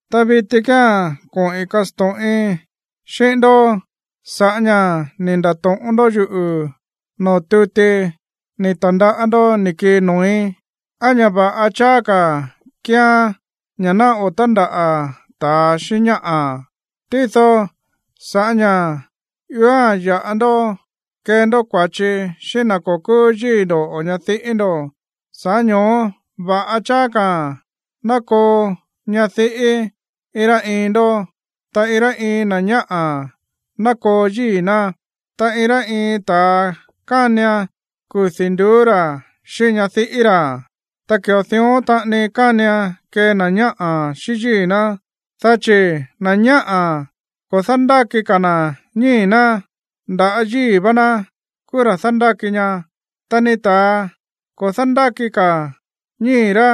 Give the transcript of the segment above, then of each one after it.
Ta viti kía̱n koꞌi̱n kasto̱ꞌin xíꞌín ndó sa̱ꞌá ña̱ ni̱ nda̱to̱ꞌón ndó yuꞌu̱ noo̱ tuti ni̱ ta̱ndaꞌá ndó ni̱ kii noo̱í, á ña̱ va̱ꞌa cháá ka̱ kíán ña̱ ná o̱ tándaꞌa̱ ta̱a xíꞌín ñáꞌa̱. Tído sa̱ꞌá ña̱ ióa̱n ya̱ꞌa ndó kee ndó kua̱chi xíꞌín na̱ ko̱ kúú yíi̱ ndo̱ o ñadiꞌí ndo̱, sa̱ꞌá ño̱ó va̱ꞌa cháá ka̱ ná koo ñadiꞌí iin rá iin ndó, ta iin rá iin na̱ ñáꞌa̱ ná koo yíi̱ ná. Ta iin rá iin ta̱a kánian kudi̱ nduú ra̱ xíꞌín ñadiꞌí ra̱, ta ki̱ꞌo dión taꞌani kánian kee na̱ ñáꞌa̱ xíꞌín yíi̱ ná. Dá chi̱ na̱ ñáꞌa̱ ko̱ dándáki ka̱ na̱ ñíi̱ ná, nda̱á yíi̱ vá ná kúú ra̱ dándáki ñaá. Ta ni ta̱a ko̱ dándáki ka̱ ñíi̱ rá,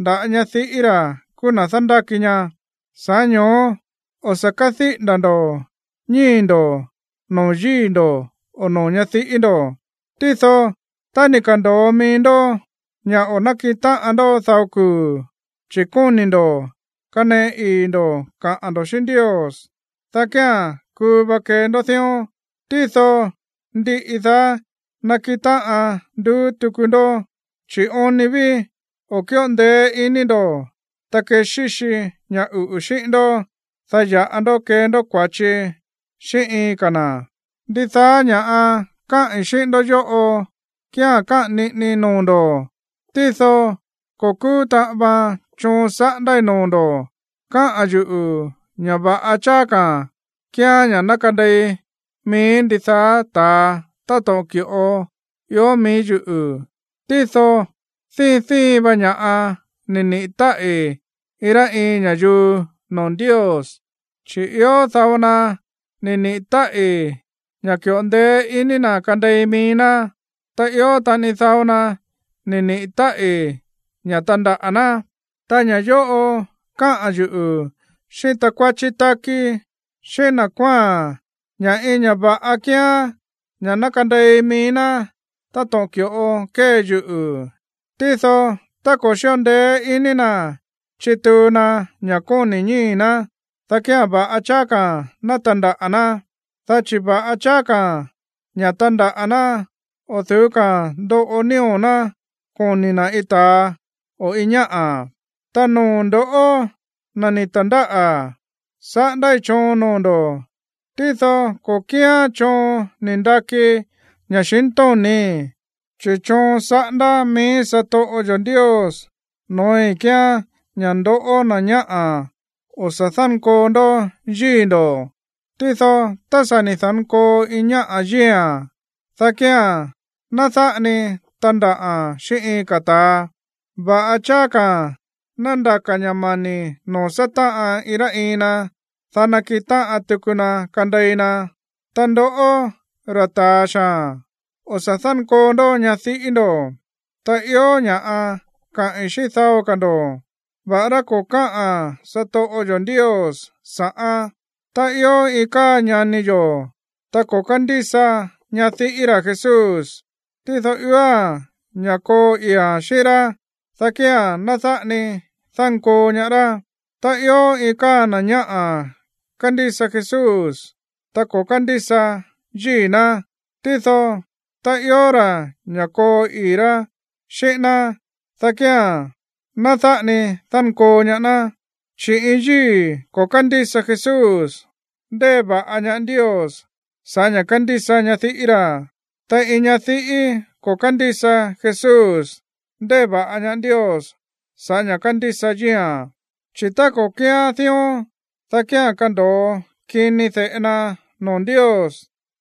nda̱á ñadiꞌí ra̱ kúú na̱ dándáki ñaá. Sa̱ꞌá ño̱ó o̱ sa̱ kádíꞌi̱nda̱ ndo̱ ñíi̱ ndo̱ noo̱ yíi̱ ndo̱ o noo̱ ñadiꞌí ndo̱. Tído tá ni̱ ka̱ndo̱o mií ndó ña̱ o̱ nákiꞌin táꞌan ndó dao kuu̱, chi̱ kóni̱ ndo̱ kaneꞌe ii̱ ndo̱ kaꞌa̱n ndo̱ xíꞌín Ndios, dá kía̱n kuu va kee ndó dión. Tído ndiꞌi daá, nakiꞌin táꞌan nduú tuku ndó, chi̱ oon ni ví o̱ kíꞌo ndeé iní ndo̱, ta kexíxi ña̱ uꞌu̱ xíꞌín ndó, dá ya̱ꞌa ndó kee ndó kua̱chi xíꞌín iin ka̱ na̱. Ndidaá ña̱ꞌa káꞌi̱n xíꞌín ndó yóꞌo kía̱n káꞌa̱n niꞌinii noo̱ ndo̱, tído ko̱ kúú taꞌan vaan choon saꞌándái̱ noo̱ ndo̱. Káꞌa̱n yuꞌu̱ ña̱ va̱ꞌa cháá ka̱ kíán ña̱ ná kandei mií ndidaá ta̱a táto̱ꞌon ki̱ꞌo ió mií yuꞌu̱. Tído díin díin va ña̱ꞌa ni̱ niꞌi̱ táꞌi̱ iin rá iin ña̱yuu noo̱ Ndios, chi̱ ió dao na ni̱ niꞌi̱ táꞌi̱ ña̱ ki̱ꞌo ndeé iní na̱ kandei mií ná, ta ió taꞌani dao na ni̱ niꞌi̱ táꞌi̱ ña̱ tandaꞌa̱ ná. Ta ña̱ yóꞌo káꞌa̱n yuꞌu̱ xíꞌín takuáchí tákí, xíꞌín na̱ kuáa̱n ña̱ iin ña̱ va̱ꞌa kíán ña̱ ná kandei mií ná táto̱ꞌon ki̱ꞌo kée yuꞌu̱. Tído tá ko̱ xíꞌo ndeé iní na̱ chituu na ña̱ kóni̱ ñíi̱ ná, dá kía̱n va̱ꞌa cháá ka̱ ná tandaꞌa̱ ná. Dá chi̱ va̱ꞌa cháá ka̱ ña̱ tandaꞌa̱ ná o̱ du̱ú ka̱a̱n ndoꞌo nío̱ ná koni na̱ iin ta̱a o iin ñáꞌa̱. Ta noo̱ ndo̱ꞌó, na̱ ni̱ ta̱ndáꞌa̱, saꞌándái̱ choon noo̱ ndo̱, tído ko̱ kíán choon ni̱ ndaki ña̱xintóni̱í, chi̱ choon saꞌándá mií satoꞌo yo̱ Ndios noo̱í kíán, ña̱ ndoꞌó, na̱ ñáꞌa̱, o̱ sa̱ dánkoo ndó yíi̱ ndo̱. Tído tá sa̱ ni̱ da̱nkoo iin ñáꞌa̱ yíi̱a̱n, dá kía̱n ná dáꞌa ni tandaꞌa̱n xíꞌín iin ka̱ ta̱a. Va̱ꞌa cháá ka̱ ná ndaka ña̱ mani̱ noo̱ sátáꞌan iin rá iin na, dá nakiꞌin táꞌan tuku na kandei na. Ta ndoꞌó, ra̱ ta̱a xaa̱n, o̱ sa̱ dánkoo ndó ñadiꞌí ndo̱. Ta ió ña̱ kaꞌi̱n xíꞌín dao ka̱ ndo̱, va̱ꞌará ko̱ káꞌa̱n satoꞌo yo̱ Ndios sa̱ꞌán. Tá ió iin káa ñani yo̱, ta ko̱ kándísa ñadiꞌí ra̱ Jesús, tído ióa̱n ña̱ koo ii̱a̱n xíꞌín rá, dá kía̱n ná dáꞌa ni dánkoo ñaá rá. Tá ió iin káa na̱ ñáꞌa̱ kándísa Jesús, ta ko̱ kándísa yíi̱ ná, tído tá ió ra̱ ña̱ koo ii̱ rá xíꞌín ná, dá kía̱n ná dáꞌa ni dánkoo ñaá ná. Chi̱ iin yíi̱ ko̱ kándísa Jesús, ndéꞌé va̱ꞌa ñaá Ndios sa̱ꞌá ña̱ kándísa ñadiꞌí ra̱. Ta iin ñadiꞌí ko̱ kándísa Jesús, ndéꞌé va̱ꞌa ñaá Ndios sa̱ꞌá ña̱ kándísa yíi̱a̱n. Chi̱ tá ko̱ kíán dión, dá kía̱n kando̱o kini de̱ꞌe na noo̱ Ndios,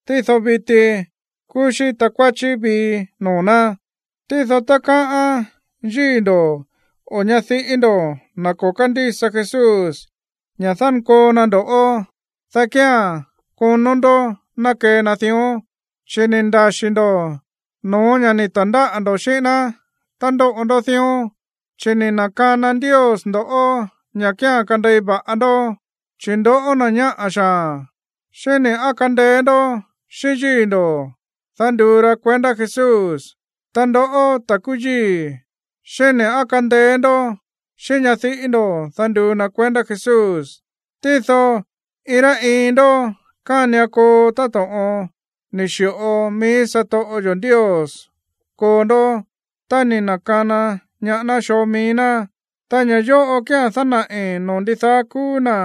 tído viti kúú xí takuáchí vii noo̱ ná. Tído tá káꞌán yíi̱ ndo̱ o ñadiꞌí ndo̱, na̱ ko̱ kándísa Jesús, ña̱ dánkoo na ndo̱ꞌó, dá kía̱n konó ndó ná kee na dión. Chi̱ ni̱ ndaxi̱ ndo̱ no̱ó ña̱ ni̱ ta̱ndáꞌa̱ ndó xíꞌín ná tá ndóꞌo ndó dión. Chi̱ ni̱ na̱kana Ndios ndo̱ꞌó ña̱ kía̱n kandei va̱ꞌa ndó. Chi̱ ndoꞌó, na̱ ñáꞌa̱ xaa̱n, ¿xíni̱ á kandeé ndó xíꞌín yíi̱ ndo̱, dá nduu ra kuendá Jesús? Ta ndoꞌó, ta̱ kúú yíi̱, ¿xíni̱ á kandeé ndó xíꞌín ñadiꞌí ndo̱, dá nduu na kuendá Jesús? Tído iin rá iin ndó kánian koo táto̱ꞌon ni̱ xi̱ꞌo mií satoꞌo yo̱ Ndios koo ndó tá ni̱ na̱kana ñaá ná xoo mií ná. Ta ña̱ yóꞌo kía̱n dánaꞌi̱ noo̱ ndidaá kúú na̱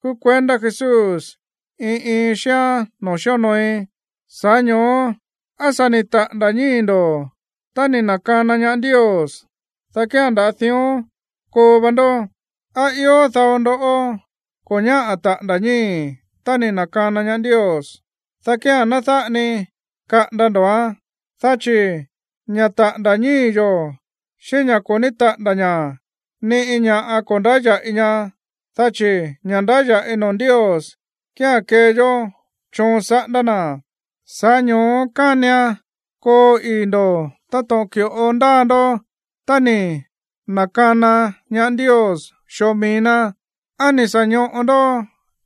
kúú kuendá Jesús iin iin xíán noo̱ xíonooi. Sa̱ꞌá ño̱ó, ¿á sa̱ ni̱ taꞌa̱nda̱ ñíi̱ ndo̱ tá ni̱ na̱kana ñaá Ndios? Dá kía̱n nda̱ dión koo va ndó. ¿Á ió dao ndó ko̱ ñáꞌa̱ taꞌa̱nda̱ ñíi̱ tá ni̱ na̱kana ñaá Ndios? Dá kía̱n ná dáꞌa ni kaꞌanda ndo̱án. Dá chi̱ ña̱ taꞌa̱nda̱ ñíi̱ yo̱ xíꞌín ña̱ ko̱ ní taꞌa̱nda̱ ña̱, ni iin ña̱ꞌa ko̱ ndáya̱ꞌi ña, dá chi̱ ña̱ ndáya̱ꞌi noo̱ Ndios kía̱n kee yó choon saꞌándá na̱. Sa̱ꞌá ño̱ó kánian koo ii̱ ndo̱ táto̱ꞌon ki̱ꞌo ndáa ndó tá ni̱ na̱kana ñaá Ndios xoo mií ná. ¿Á ni̱ sa̱ ñoꞌo ndó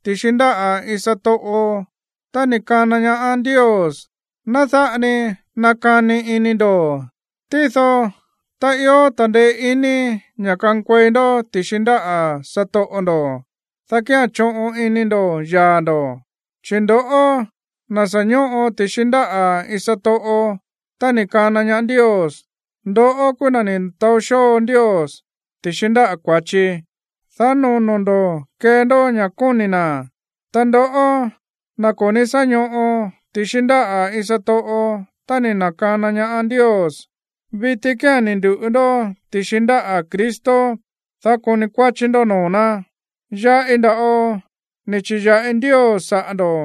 ti̱xi ndáꞌa̱ iin satoꞌo tá ni̱ kana ñaá Ndios? Ná dáꞌa ni nakani ini ndo̱. Tído tá ió ta̱ndeé iní ña̱ kankuei ndó ti̱xi ndáꞌa̱ satoꞌo ndo̱, dá kía̱n choꞌon ini ndo̱ yaa̱ ndo̱. Chi̱ ndoꞌó, na̱ sa̱ ñoꞌo ti̱xi ndáꞌa̱ iin satoꞌo tá ni̱ kana ñaá Ndios, ndoꞌó kúú na̱ ni̱ taó xóo Ndios ti̱xi ndáꞌa̱ kua̱chi, dá nono̱ ndo̱ kee ndó ña̱ kóni̱ na̱. Ta ndoꞌó, na̱ ko̱ ní sá ñoꞌo ti̱xi ndáꞌa̱ iin satoꞌo tá ni̱ na̱kana ñaá Ndios, viti kía̱n ni̱ ndu̱ꞌu ndó ti̱xi ndáꞌa̱ Cristo, dá koni kuáchí ndó noo̱ ná. Yaꞌi nda̱ꞌo ni̱ chi̱ya̱ꞌi Ndios saꞌa̱ ndo̱,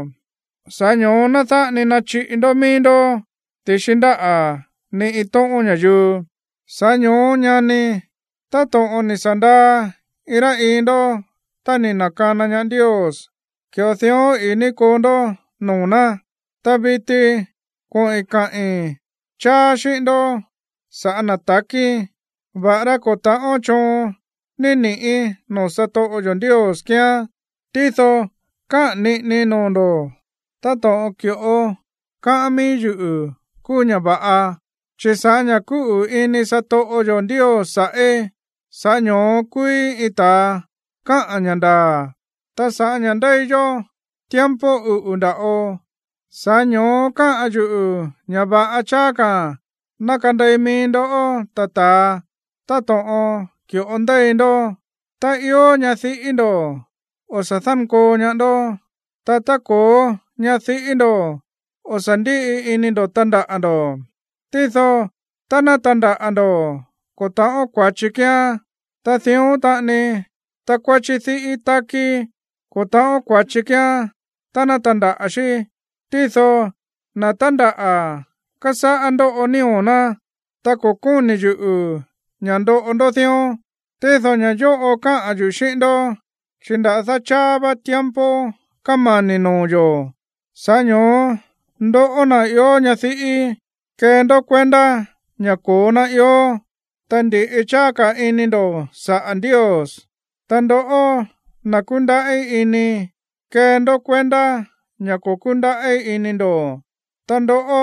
sa̱ꞌá ño̱ó ná dáꞌa ni nachiꞌi ndó mií ndó ti̱xi ndáꞌa̱ ni iin tóꞌón ña̱yuu. Sa̱ꞌá ño̱ó, ñani, táto̱ꞌon ni̱ sa̱ ndaa iin rá iin ndó tá ni̱ na̱kana ñaá Ndios, ki̱ꞌo dión ii̱ ní koo ndó noo̱ ná. Ta viti koꞌi̱n kaꞌi̱n cháá xíꞌín ndó sa̱ꞌá na̱ ta̱kí, va̱ꞌará ko̱ ta̱ꞌón choon ní ni̱ꞌí noo̱ satoꞌo yo̱ Ndios kíán. Tído káꞌa̱n niꞌinii noo̱ ndo̱ táto̱ꞌon ki̱ꞌo káꞌán mií yuꞌu̱ kúú ña̱ va̱ꞌa, chi̱ sa̱ꞌá ña̱ kúꞌu̱ ini satoꞌo yo̱ Ndios sa̱ꞌí, sa̱ꞌá ño̱ó kúúí iin ta̱a káꞌa̱n ña̱ ndaa̱. Ta sa̱ꞌá ña̱ ndéi yó tiempo uꞌu̱ nda̱ꞌo, sa̱ꞌá ño̱ó káꞌán yuꞌu̱ ña̱ va̱ꞌa cháá ka̱ ná kandei mií ndó, ta̱ ta̱a, táto̱ꞌon ki̱ꞌo ndéi ndó. Tá ió ñadiꞌí ndo̱, o̱ sa̱ dánkoo ñaá ndó. Ta tá ko̱ó ñadiꞌí ndo̱, o̱ sa̱ ndíꞌi ini ndo̱ tandaꞌa̱ ndo̱. Tído tá ná tandaꞌa̱ ndo̱, ko̱ ta̱ꞌón kua̱chi kíán. Ta dión taꞌani takuáchí diꞌí tákí, ko̱ ta̱ꞌón kua̱chi kíán tá ná tandaꞌa̱ xí. Tído na̱ tándaꞌa̱, kasáꞌá ndoꞌo nío̱ ná, ta ko̱ kóni̱ yuꞌu̱ ña̱ ndoꞌo ndó dión. Tído ña̱ yóꞌo káꞌa̱n yuꞌu̱ xíꞌín ndó, chi̱ nda̱dá cháá vá tiempo kámani̱ noo̱ yo̱. Sa̱ꞌá ño̱ó ndoꞌó, na̱ ió ñadiꞌí, kee ndó kuendá ña̱ ko̱ó ná ió, ta ndi̱ꞌi cháá ka̱ ini ndo̱ saꞌa̱ Ndios. Ta ndoꞌó, na̱ kúndaꞌí ini, kee ndó kuendá ña̱ ko̱ kúndaꞌí ini ndo̱. Ta ndoꞌó,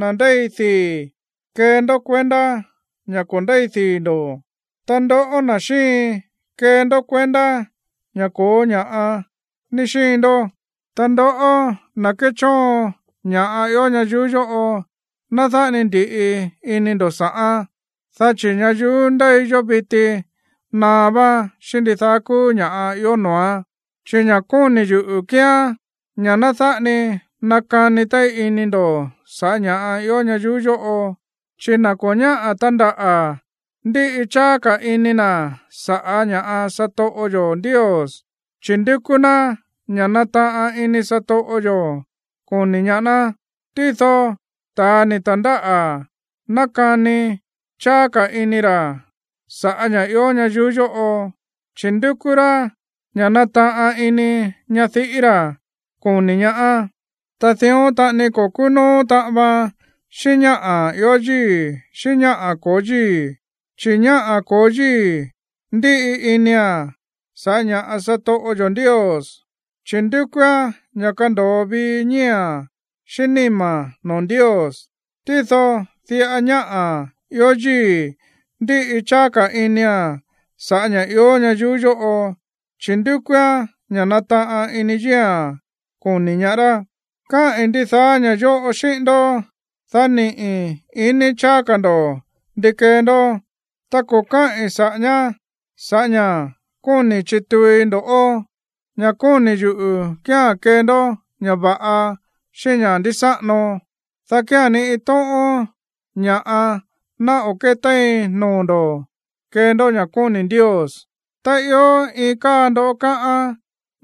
na̱ ndéi dii̱, kee ndó kuendá ña̱ ko̱ ndéi dii̱ ndo̱. Ta ndoꞌó, na̱ xíin, kee ndó kuendá ña̱ ko̱ó ña̱ꞌa ní xíin ndó. Ta ndoꞌó, na̱ kéchóon ña̱ꞌa ió ñayuú yóꞌo, ná dáꞌa ni ndi̱ꞌi ini ndo̱ sa̱ꞌán. Dá chi̱ ñayuú ndéi yó viti naá váán xíꞌín ndidaá kúú ña̱ꞌa ió noo̱án. Chi̱ ña̱ kóni̱ yuꞌu̱ kíán ña̱ ná dáꞌa ni nakani téí ini ndo̱ sa̱ꞌá ña̱ꞌa ió ñayuú yóꞌo. Chi̱ na̱ ko̱ ñáꞌa̱ tandaꞌa̱, ndíꞌi cháá ka̱ ini na̱ sa̱ꞌá ña̱ꞌa satoꞌo yo̱ Ndios, chi̱ ndúkú ná ña̱ nataꞌan ini satoꞌo yo̱ koni ñaá ná. Tído ta̱a ni̱ ta̱ndáꞌa̱, nákani cháá ka̱ ini ra̱ sa̱ꞌá ña̱ ió ñayuú yóꞌo, chi̱ ndúkú rá ña̱ nataꞌan ini ñadiꞌí ra̱ koni ñaáán. Ta dión taꞌani ko̱ kúú nóó taꞌan vaan xíꞌín ñáꞌa̱ ió yíi̱ xíꞌín ñáꞌa̱ ko̱ó yíi̱. Chi̱ ñáꞌa̱ ko̱ó yíi̱, ndíꞌi inia̱n sa̱ꞌá ña̱ꞌa satoꞌo yo̱ Ndios, chi̱ ndúkúán ña̱ kando̱o vii ñíi̱a̱n, xíꞌín níma̱n noo̱ Ndios. Tído diꞌa ñáꞌa̱ ió yíi̱, ndíꞌi cháá ka̱ inia̱n sa̱ꞌá ña̱ ió ñayuú yóꞌo, chi̱ ndúkúán ña̱ nataꞌan ini yíi̱a̱n koni ñaá rá. Káꞌi̱n ndidaá ña̱ yóꞌo xíꞌín ndó, dá niꞌi̱ i̱ní cháá ka̱ ndo̱ ndi kee ndó. Ta ko̱ káꞌi̱n saꞌa̱ ñá sa̱ꞌá ña̱ kóni̱i̱ chituui ndo̱ꞌó. Ña̱ kóni̱ yuꞌu̱ kía̱n kee ndó ña̱ va̱ꞌa xíꞌín ña̱ ndísáꞌano, dá kía̱n ni iin tóꞌón ña̱ꞌa ná o̱ kétéin noo̱ ndo̱ kee ndó ña̱ kóni̱ Ndios. Tá ió iin káa ndó káꞌán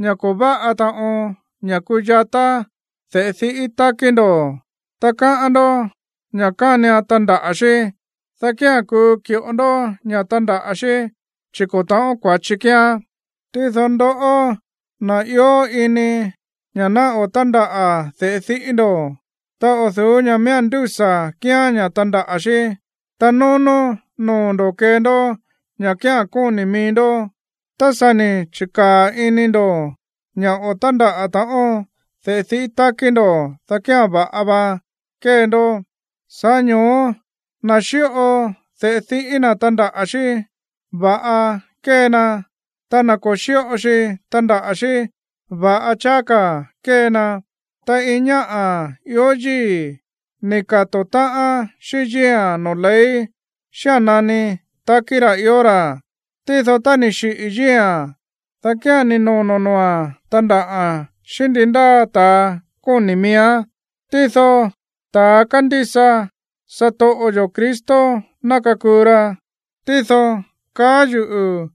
ña̱ ko̱ váꞌa taꞌon ña̱ kuyatá de̱ꞌe diꞌí tákí ndo̱, ta káꞌán ndó ña̱ kánian tandaꞌa̱ xí, dá kía̱n kuu ki̱ꞌo ndó ña̱ tandaꞌa̱ xí, chi̱ ko̱ ta̱ꞌón kua̱chi kíán. Tído ndoꞌó, na̱ ió ini ña̱ ná o̱ tándaꞌa̱ de̱ꞌe diꞌí ndo̱, ta o̱ du̱ú ña̱ miía̱n ndúsa̱ kíán ña̱ tandaꞌa̱ xí, ta nónó noo̱ ndo̱ kee ndó ña̱ kía̱n kóni̱ mií ndó, tá sa̱ ni̱ chi̱kaa̱ ini ndo̱ ña̱ o̱ tándaꞌa̱ ta̱ꞌón de̱ꞌe diꞌí tákí ndo̱, dá kía̱n va̱ꞌa va kée ndó. Sa̱ꞌá ño̱ó, na̱ xíꞌo de̱ꞌe diꞌí na̱ tandaꞌa̱ xí, va̱ꞌa kée na, ta na̱ ko̱ xíꞌo xi tandaꞌa̱ xí, va̱ꞌa cháá ka̱ kée na. Ta iin ñáꞌa̱ ió yíi̱, ni̱ kato̱ táꞌan xíꞌín yíi̱a̱n noo̱ ley xía̱n nani takí ra̱ ió ra̱. Tído tá ni̱ xiꞌi̱ yíi̱a̱n, dá kía̱n ni̱ nono̱ noo̱a̱n tandaꞌa̱n xíꞌín ndi ndáa ta̱a kóni̱ miíán, tído ta̱a kándísa satoꞌo yo̱ Cristo ná kakuu ra. Tído kaá yuꞌu̱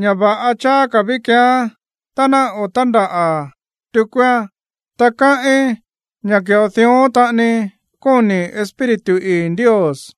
ña̱ va̱ꞌa cháá ka̱ ví keeán tá ná o̱ tándaꞌa̱ tukuán, ta káꞌín ña̱ ki̱ꞌo dión taꞌani kóni̱ Espíritu ii̱ Ndios.